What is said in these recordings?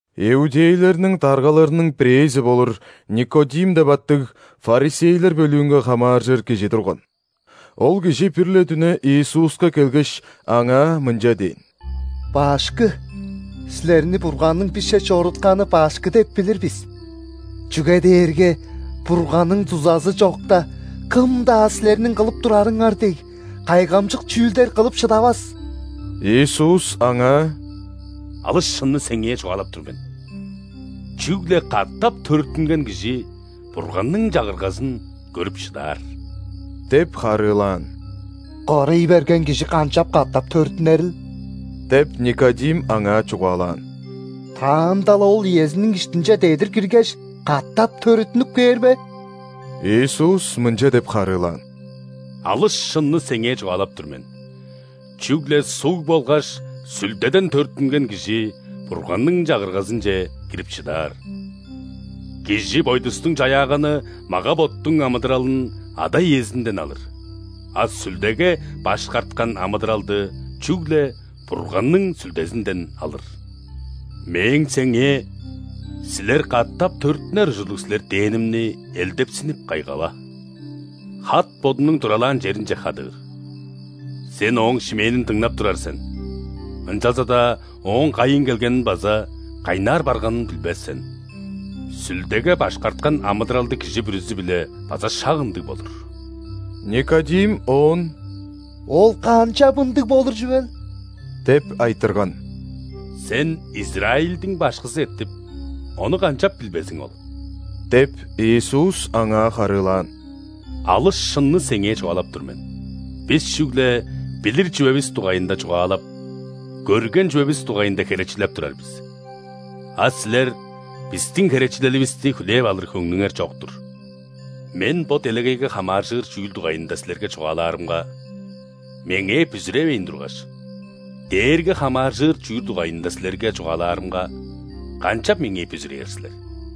Иудейлерниң даргаларының бирээзи болур, Никодим деп аттыг, ·фарисейлер бөлүүнге хамааржыр кижи турган. Ол кижи бир-ле дүне Иисуска келгеш, Аңаа мынча дээн: «Башкы! Силерни Бурганның бисче чорутканы башкы деп билир бис. Чүге дээрге Бурганның дузазы чокта, кым-даа Силерниң кылып турарыңар дег кайгамчык чүүлдер кылып шыдавас». Иисус аңаа: «Алыс шынны сеңээ чугаалап тур мен: чүгле катап төрүттүнген кижи Бурганның Чагыргазын көрүп шыдаар» – деп харыылаан. «Кырый берген кижи канчап катап төрүттүнерил? – деп, Никодим Аңаа чугаалаан. – Таанда-ла ол иезиниң иштинче дедир киргеш, катап төрүттүнүп кээр бе?» Иисус мынча деп харыылаан: «Алыс шынны сеңээ чугаалап тур мен: чүгле суг болгаш Сүлдеден төрүттүнген кижи Бурганның Чагыргазынче кирип шыдаар! Кижи бойдустуң чаяаганы мага-боттуң амыдыралын ада-иезинден алыр, а Сүлдеге башкарткан амыдыралды чүгле Бурганның Сүлдезинден алыр. Мээң сеңээ: „Силер катапR төрүттүнер ужурлуг силер“ – дээнимни элдепсинип кайгава. Хат бодунуң туралаан черинге хадыыр. Сен ооң шимээнин дыңнап турар сен, ынчалза-даа ооң кайыын келгенин база кайнаар барганын билбес сен. Сүлдеге башкарткан амыдыралдыг кижи бүрүзү-биле база шак ындыг болур». Никодим Оон: «Ол канчап ындыг болур чүвел?» – деп айтырган. «Сен, Израильдиң башкызы эртип, ону канчап билбезиң ол? – деп, Иисус аңаа харыылаан. – Алыс шынны сеңээ чугаалап тур мен: бис чүгле билир чүвевис дугайында чугаалап, көрген чүвевис дугайында херечилеп турар бис, а силер бистиң херечилеливисти хүлээп алыр хөңнүңер чок-тур. Мен бо делегейге хамааржыр чүүл дугайында силерге чугаалаарымга, Меңээ бүзүревейн тургаш, дээрге хамааржыр чүүл дугайында силерге чугаалаарымга, канчап Меңээ бүзүрээр силер?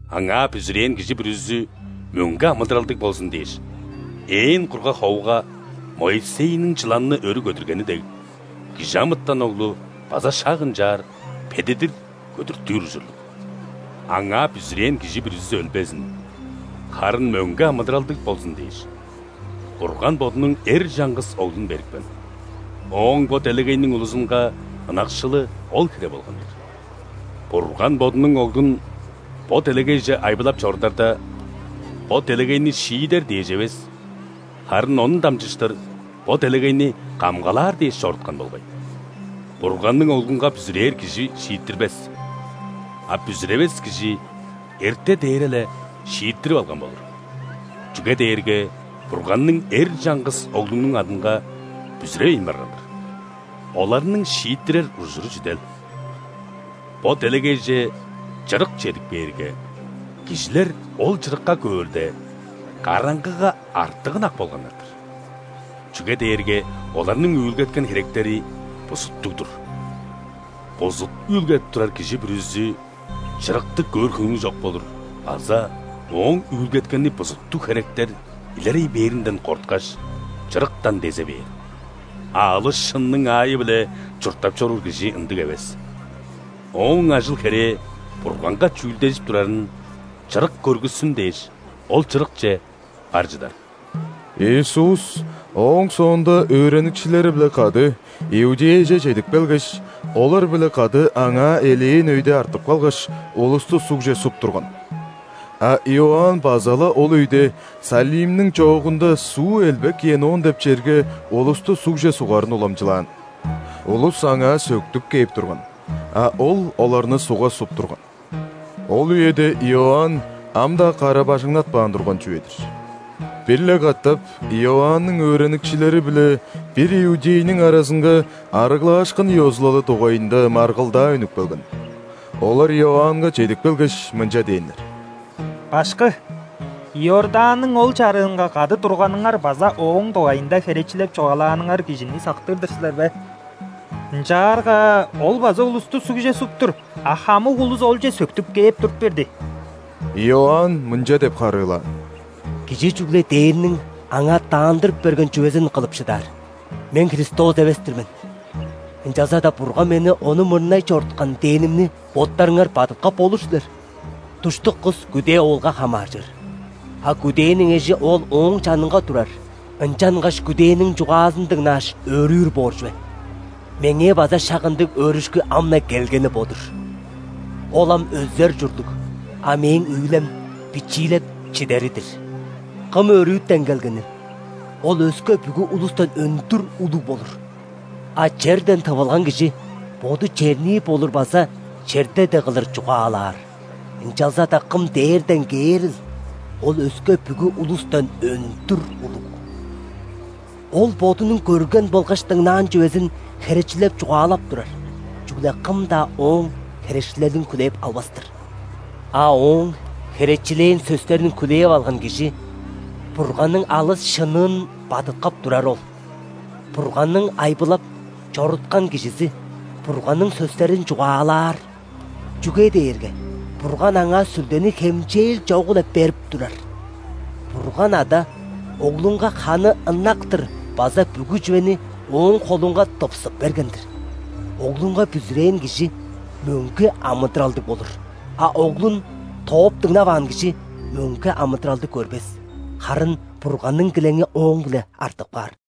Аңаа бүзүрээн кижи бүрүзү мөңге амыдыралдыг болзун дээш, ээн кургаг ховуга Моисейниң чыланны өрү көдүргени дег, Кижи амытан Оглу база шак ынчаар бедидир көдүртүр ужурлуг». Аңаа бүзүрээн кижи бүрүзү өлбезин, харын мөңге амыдыралдыг болзун дээш, Бурган Бодунуң эр чаңгыс Оглун берипкен. Ооң бо делегейниң улузунга ынакшылы ол хире болган-дыр. Бурган Бодунуң Оглун бо делегейже айбылап чорударда, бо делегейни шиидер дээш эвес, харын Ону дамчыштыр бо делегейни камгалаар дээш чоруткан болгай. Бурганның Оглунга бүзүрээр кижи шииттирбес, а бүзүревес кижи – эрте дээре-ле шииттирип алган болур, чүге дээрге Бурганның эр чаңгыс Оглунуң адынга бүзүревейн барган-дыр. Оларның шииттирер ужуру чүдел: бо делегейже Чырык чедип кээрге, кижилер ол Чырыкка көөрде, караңгыга артык ынак болганнар-дыр, чүге дээрге оларның үүлгеткен херектери бузуттуг-дур. Бузут үүлгедип турар кижи бүрүзү чырыкты көөр хөңнү чок болур база ооң үүлгеткени бузуттуг херектер илерей бээринден корткаш, чырыктан дезе бээр. А алыс шынның аайы-биле чурттап чоруур кижи ындыг эвес. Ооң ажыл-херээ Бурганга чүүлдежип турарын Чырык көргүссүн дээш, ол Чырыкче бар чыдар. Иисус ооң соонда өөреникчилери-биле кады Иудеяже чедип келгеш, олар-биле кады аңаа элээн өйде артып калгаш, улусту ·сугже суп турган. А Иоанн база-ла ол өйде Салимниң чоогунда суу элбек Енон деп черге улусту сугже сугарын уламчылаан. Улус аңаа сөктүп кээп турган, а ол оларны ·сугга суп турган. (Ол үеде Иоанн ам-даа кара-бажыңнатпаан турган чүве-дир). Бир-ле катап Иоанның өөреникчилери биле бир иудейниң аразынга ·арыглаашкын ёзулалы дугайында маргылдаа үнүп келген. Олар Иоаннга чедип келгеш, мынча дээннер: «Башкы, Иорданның ол чарыынга кады турганыңар база Ооң дугайында херечилеп чугаалааныңар Кижини сактыр-дыр силер бе? Ынчаарга Ол база улусту сугже суп тур, а хамык улус Олче сөктүп кээп туруп берди». Иоанн мынча деп харыылаан: «Кижи чүгле дээрниң аңаа даандырып берген чүвезин кылып шыдаар. „Мен Христос эвес-тир мен, ынчалза-даа Бурган мени Ону мурнай чоруткан“ – дээнимни боттарыңар бадыткап болур силер. Душтук кыс күдээ оолга хамааржыр. А күдээниң эжи оол ооң чанынга турар, ынчангаш күдээниң чугаазын дыңнааш, өөрүүр боор чүве. Меңээ база шак ындыг өөрүшкү ам-на келгени бо-дур. Ол ам өзер ужурлуг, а мээң үүлем – бичиилеп чидери-дир». Кым өрүтен келгенил, Ол өске бүгү улустан өндүр улуг болур. А черден тывылган кижи – боду чернии болур база черде дег кылдыр чугаалаар. Ынчалза-даа Кым дээрден кээрил, Ол өске бүгү улустан өндүр улуг. Ол Бодунуң көрген болгаш дыңнаан чүвезин херечилеп чугаалап турар, чүгле кым-даа Ооң херечилелин хүлээп албас-тыр. А Ооң херечилээн сөстерин хүлээп алган кижи Бурганның алыс шынныын бадыткап турары ол. Бурганның айбылап чоруткан Кижизи Бурганның сөстерин чугаалаар, чүге дээрге Бурган Аңаа Сүлдени хемчээл чогу-биле берип турар. Бурган Ада Оглунга ханы ынак-тыр база бүгү чүвени Ооң холунга тыпсып берген-дир. Оглунга бүзүрээн кижи мөңге амыдыралдыг болур. А Оглун тооп дыңнаваан кижи мөңге амыдыралды көрбес, харын Бурганның килеңи ооң-биле артып каар.